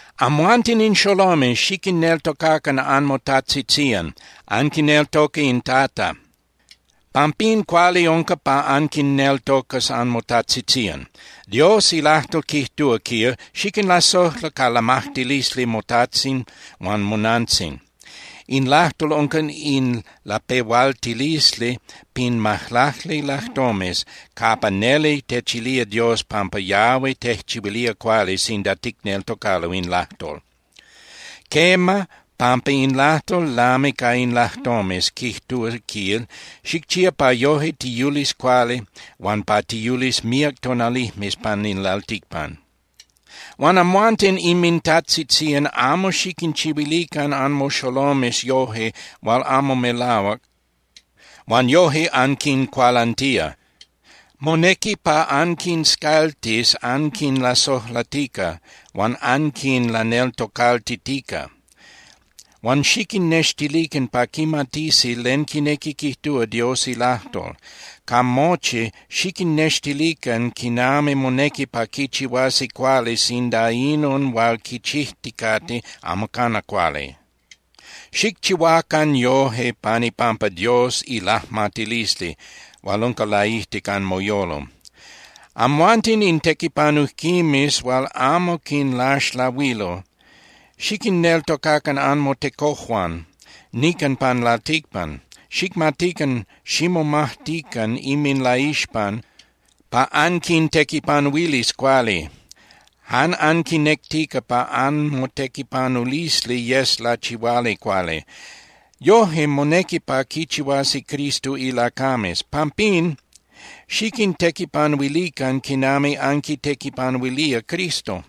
Amhuanten in xolomes, xiquinneltocacan anmotajtzitzían. Anquineltoca in Tata, pampín cuali unca pa anquinneltocas anmotajtzitzían. Dios ilajtol quijtúa, quil: “Xiquinlasojla ca lamajtilisli motajtzin huan monantzin.” In lajtol unca in lapehualtilisli pin majlacli lajtomes capa neli techilía Dios pampa yahui tejchihuilía cuali sinda ticneltocalo in lajtol. Quema, pampa in lajtol lami ca in lajtomes, quijtúa, quil: “Xicchía, pa yoje tiyulis cuali huan pa tiyulis míac tonalijmes pan in lalticpan.” Huan amhuanten inmintajtzitzían amo xiquinchihuilican anmoxolomes yoje hual amo melahuac huan yoje anquincualantía. Monequi pa anquinscaltis anquinlasojlatica huan anquinlaneltocaltitica. Huan xiquinnextilican pa quimatisi len quinequi quijtúa Dios ilajtol. Ca mochi, xiquinnextilican quinami monequi pa quichihuasi cuali sinda inon hual quichijticate amo cana cuali. Xicchihuacan yoje pan ipampa Dios ilajmatilisli hual unca laijtic anmoyolo. Amhuanten in tequipanujquimes hual amo quinlaxlahuilo, xiquinneltocacan anmotecojuan nican pan lalticpan. Xicmatican ximomajtican inminlaixpan pa anquintequipanuilis cuali, jan anquinectica pa anmotequipanulisli yes lachihuali cuali. Yoje monequi pa quichihuasi Cristo ilacames. Pampín, xiquintequipanuilican quinami anquitequipanuilía Cristo.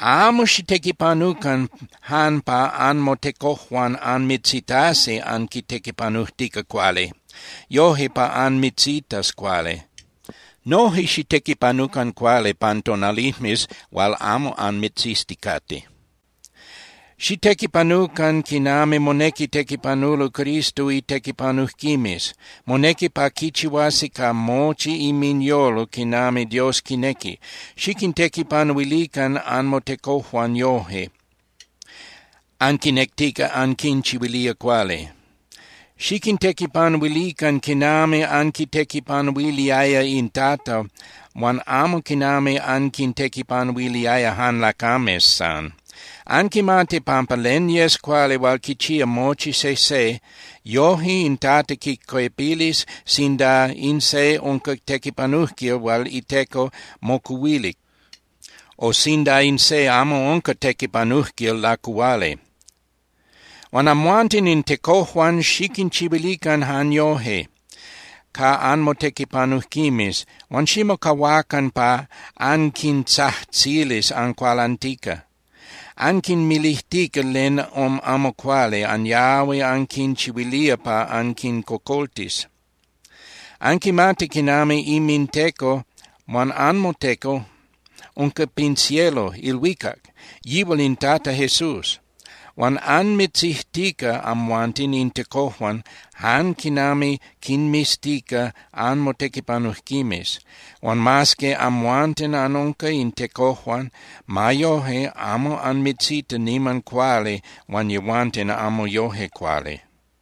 Amo xitequipanucan jan pa anmotecojuan anmitzitasi antequipanujtica cuali, yoje pa anmitzitas cuali. Noje xitequipanucan cuali pan tonalijmes hual amo anmitzizticate. Xitequipanucan quinami monequi tequipanulo Cristo itequipanujquimes. Monequi pa quichihuasi ca mochi inminyolo quinami Dios quinequi. Xiquintequipanuilican anmotecojuan yoje, anquinectica anquinchihuilía cuali. Xiquintequipanuilican quinami anquitequipanuiliaya in Tata huan amo quinami anquintequipanuiliaya jan lacames san. Anquimati pampa len yes cuali hual quichía mochi sejse, yoje in Tata quicuepilis sinda in se unca tequipanujquil hual iteco mocuhuilic, o sinda in se amo unca tequipanujquil lacuhuali. Huan amhuanten in tecojuan xiquinchihuilican jan yoje ca anmotequipanujquimes huan ximocahuacan pa anquintzajtzilis ancualantica, anquinmilijtica len amo cuali anyahui anquinchihuilía pa anquincocoltis. Anquimati quinami inminTeco huan anmoTeco unca pin cielo (ilhuicac), yihual in Tata Jesús. Huan anmitziztica amhuanten in tecojuan jan quinami quinmiztica anmotequipanujquimes. Huan mas que amhuanten anunca in tecojuan, ma yoje amo anmitzita niman cuali huan yehuanten amo yoje cuali.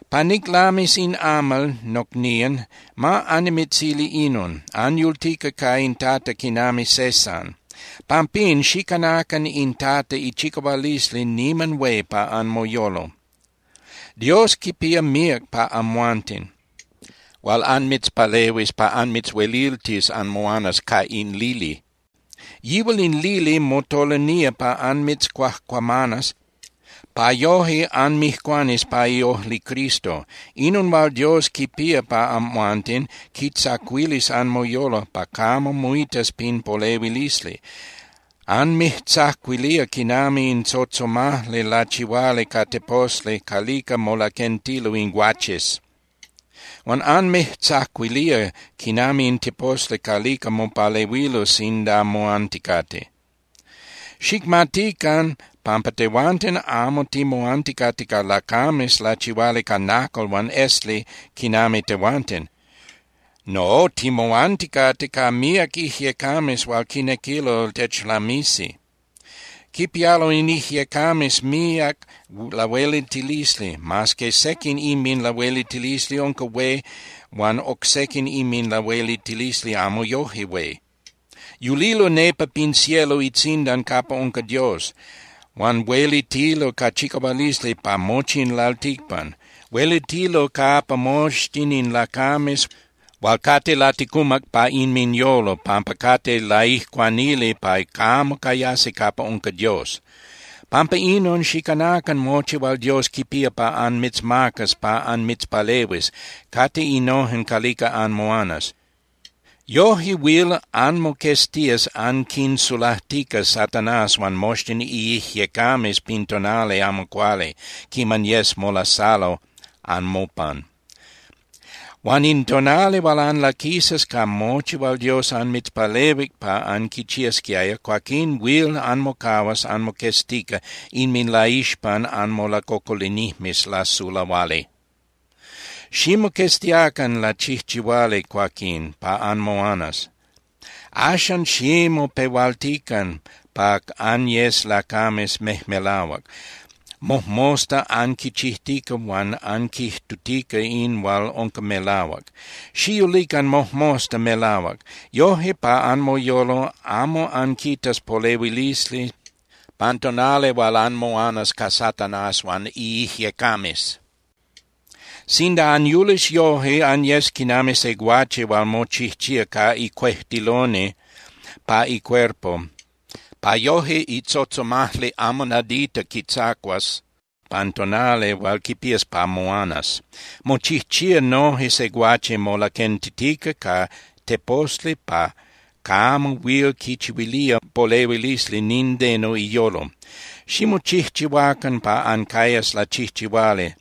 Pa niclamis in amal, nocnían, ma annimitzili inon: Anyultica ca in Tata quinami se san. Pampín, xicanacan in Tata ichicahualisli niman hué pa anmoyolo. Dios quipía míac pa amhuanten hual anmitzpalehuis pa anmitzhueliltis anmoanas ca in lili. Yihual in lili motolinía pa anmitzcuajcuamanas pa yoje anmijcuanis pa iojli Cristo. Inon hual Dios quipía pa amhuanten quitzacuilis anmoyolo pa camo moitas pin polehuilisli. Anmijtzacuilía quinami in tzotzomajli lachihuali ca teposli calica molaquentilo in guaches. Huan anmijtzacuilía quinami in teposli calica mopalehuilo sinda moanticate. Xicmatican pampa tehuanten amo timoanticate ca lacames lachihuali ca nacal huan esli quinami tehuanten. No, timoanticate ca míac ijyecames hual quinequilo techlamisi. Quipialo in ijyecames míac lahueliltilisli, mas que sequin inminlahueliltilisli unca hué huan oc sequin inminlahueliltilisli amo yoje hué. Yulilo nepa pin cielo itzindan capa unca Dios, huan huelitilo ca chicahualisli pa mochi in lalticpan. Huelitilo capa moxtin in lacames hual cate laticumac pa inminyolo pampa cate laijcuanili pa camo cayasi capa unca Dios. Pampa inon, xicanacan mochi hual Dios quipía pa anmitzmacas pa anmitzpalehuis, cate innojen calica anmoanas. Yoje huil anmoqueztías anquisulajtica Satanás huan moxtin iijyecames pin tonali amo cuali quiman yes molasalo anmopan. Huan in tonali hual anlaquisas ca mochi hual Dios anmitzpalehuic pa anquichiasquiaya, cuaquín huil anmocahuas anmoqueztica inminlaixpan anmolacocolinijmes lasulahuali. Ximoqueztiacan lachijchihuali cuaquín, pa anmoanas. Axan, ximopehualtican pa anyes lacames mejmelahuac, mojmosta anquichijtica huan anquijtutica in hual unca melahuac. Xiyulican mojmosta melahuac. Yoje pa anmoyolo amo anquitas polehuilisli pan tonali hual anmoanas ca Satanás huan iijyecames. Sinda anyulis yoje, anyes quinami se guache hual mochijchía ca icuejtiloni pa icuerpo pa yoje itzotzomajli amo nadita quitzacuas pan tonali hual quipías pa moanas. Mochijchía noje se guache molaquentitica ca teposli pa camo huil quichihuilía polehuilisli nindeno iyolo. Ximochijchihuacan pa ancayas lachijchihuali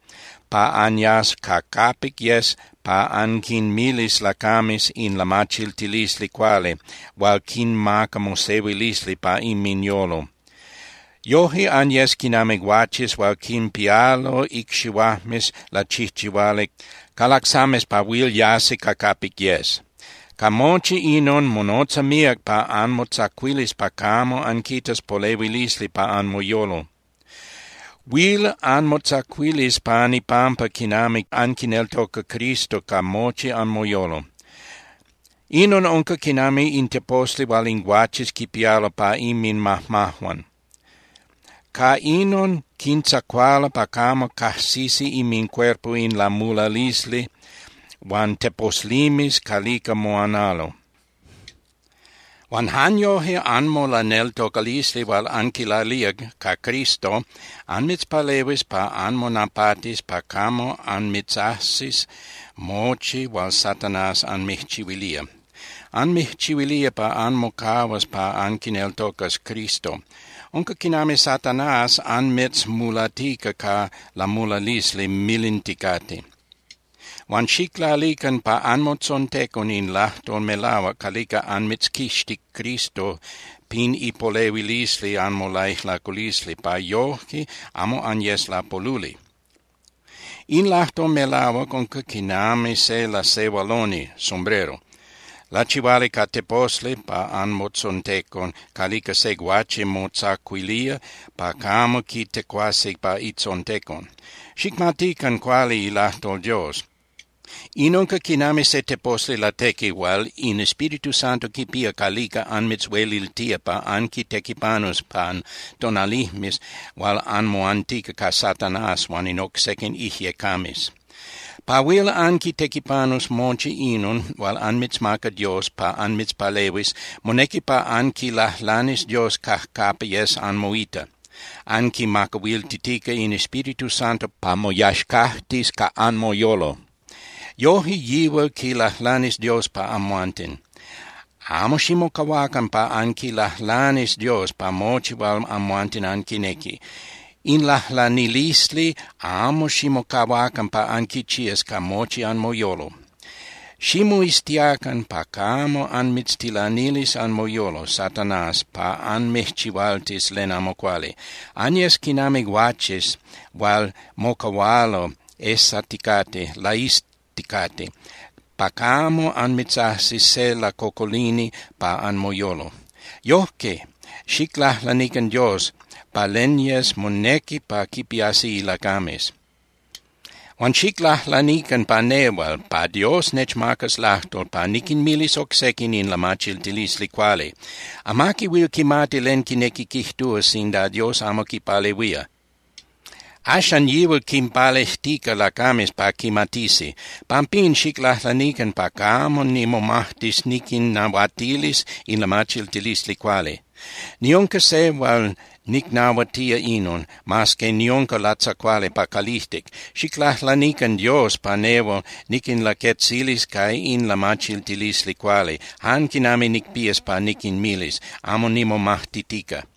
pa anyas ca capic yes pa anquinmilis lacames in lamachiltilisli cuali hual quinmaca mosehuilisli pa inminyolo. Yoje anyes quinami guaches hual quinpialo icxihuajmes lachijchihuali ca lacsames pa huil yasi ca capic yes. Ca mochi inon, monotza míac pa anmotzacuilis pa camo anquitas polehuilisli pa anmoyolo. Huil anmotzacuilis pan ipampa quinami anquineltoca Cristo ca mochi anmoyolo. Inon unca quinami in teposli hual in guaches quipialo pa inminmajmajuan. Ca inon quintzacualo pa camo cajsisi inmincuerpo in lamulalisli huan teposlimes calica moanalo. Huan jan yoje anmolaneltocalisli hual anquilalía ca Cristo anmitzpalehuis pa anmonapatis pa camo anmitzajsis mochi hual Satanás anmijchihuilía. Anmijchihuilía pa anmocahuas pa anquineltocas Cristo. Unca quinami Satanás anmitzmulatica ca lamulalisli milinticate. Huan xiclalican pa anmotzontecon in lajtol melahuac calica anmitzquixtic Cristo pin ipolehuilisli anmolaijlaculisli pa yoje amo anyes lapoluli. In lajtol melahuac unca quinami se lasehualoni (sombrero) lachihuali ca teposli pa anmotzontecon calica se guache motzacuilía pa camo quitecuasi pa itzontecon. Xicmatican cuali ilajtol Dios. In unca quinami se teposli latequi hual in Espíritu Santo quipía calica anmitzhueliltía pa anquitequipanus pan tonalijmes hual anmoantica ca Satanás huan in oc sequin ijyecames. Pa huil anquitequipanus mochi inon hual anmitzmaca Dios pa anmitzpalehuis, monequi pa anquilajlanis Dios cajcapa yes anmoita, anquimacahuiltitica in Espíritu Santo pa moyaxcajtis ca anmoyolo. Yoje yihual quilajlanis Dios pa amhuanten. Amo ximocahuacan pa anquilajlanis Dios pa mochi hual amhuanten anquinequi. In lajlanilisli amo ximocahuacan pa anquichías ca mochi anmoyolo. Ximoiztiacan pa camo anmitztilanilis anmoyolo Satanás pa anmijchihualtis len amo cuali. Anyes quinami guaches hual mocahualo ejsaticate, laizticate, pa camo anmitzajsis se lacocolini pa anmoyolo. Yojque xiclajlanican Dios pa len yes monequi pa quipiasi ilacames. Huan xiclajlanican pa nehual, pa Dios nechmacas lajtol pa niquinmilis oc sequin in lamachiltilisli cuali. Amaqui huil quimati len quinequi quijtúa sinda Dios amo quipalehuía. Axan yihual quinpalejtica lacames pa quimatisi. Pampín, xiclajlanican pa camo nimomajtis niquinnahuatilis in lamachiltilisli cuali. Niunca se hual nicnahuatía inon, mas que niunca latzacuali pa calijtic. Xiclajlanican Dios pa nehual niquinlaquetzilis ca in lamachiltilisli cuali, jan quinami nicpías pa niquinmilis, amo nimomajtitica.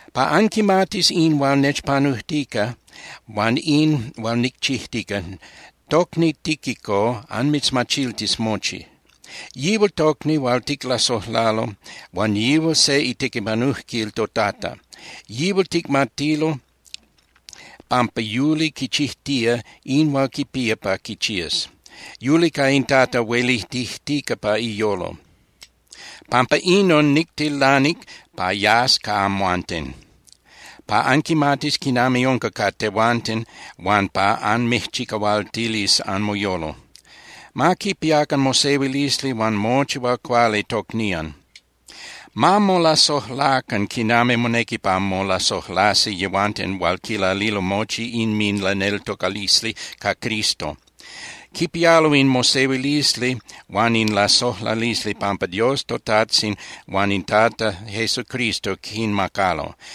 Pa anquimatis in hual nechpanujtica huan in hual nicchijtica, tocni Tíquico anmitzmachiltis mochi. Yihual tocni hual ticlasojlalo huan yihual se itequipanujquil toTata. Yihual ticmatilo pampa yuli quichijtía in hual quipía pa quichías. Yuli ca in Tata huelitijtica pa iyolo. Pampa inon, nictilanic pa yas ca amhuanten, pa anquimatis quinami unca ca tehuanten huan pa anmijchicahualtilis anmoyolo. Ma quipiacan mosehuilisli huan mochi hual cuali tocnían. Ma molasojlacan quinami monequi pa molasojlasi yehuanten hual quilalilo mochi inminlaneltocalisli ca Cristo. Quipialo in mosehuilisli huan in lasojlalisli pampa Dios toTajtzin huan in Tata Jesucristo quinmacalo.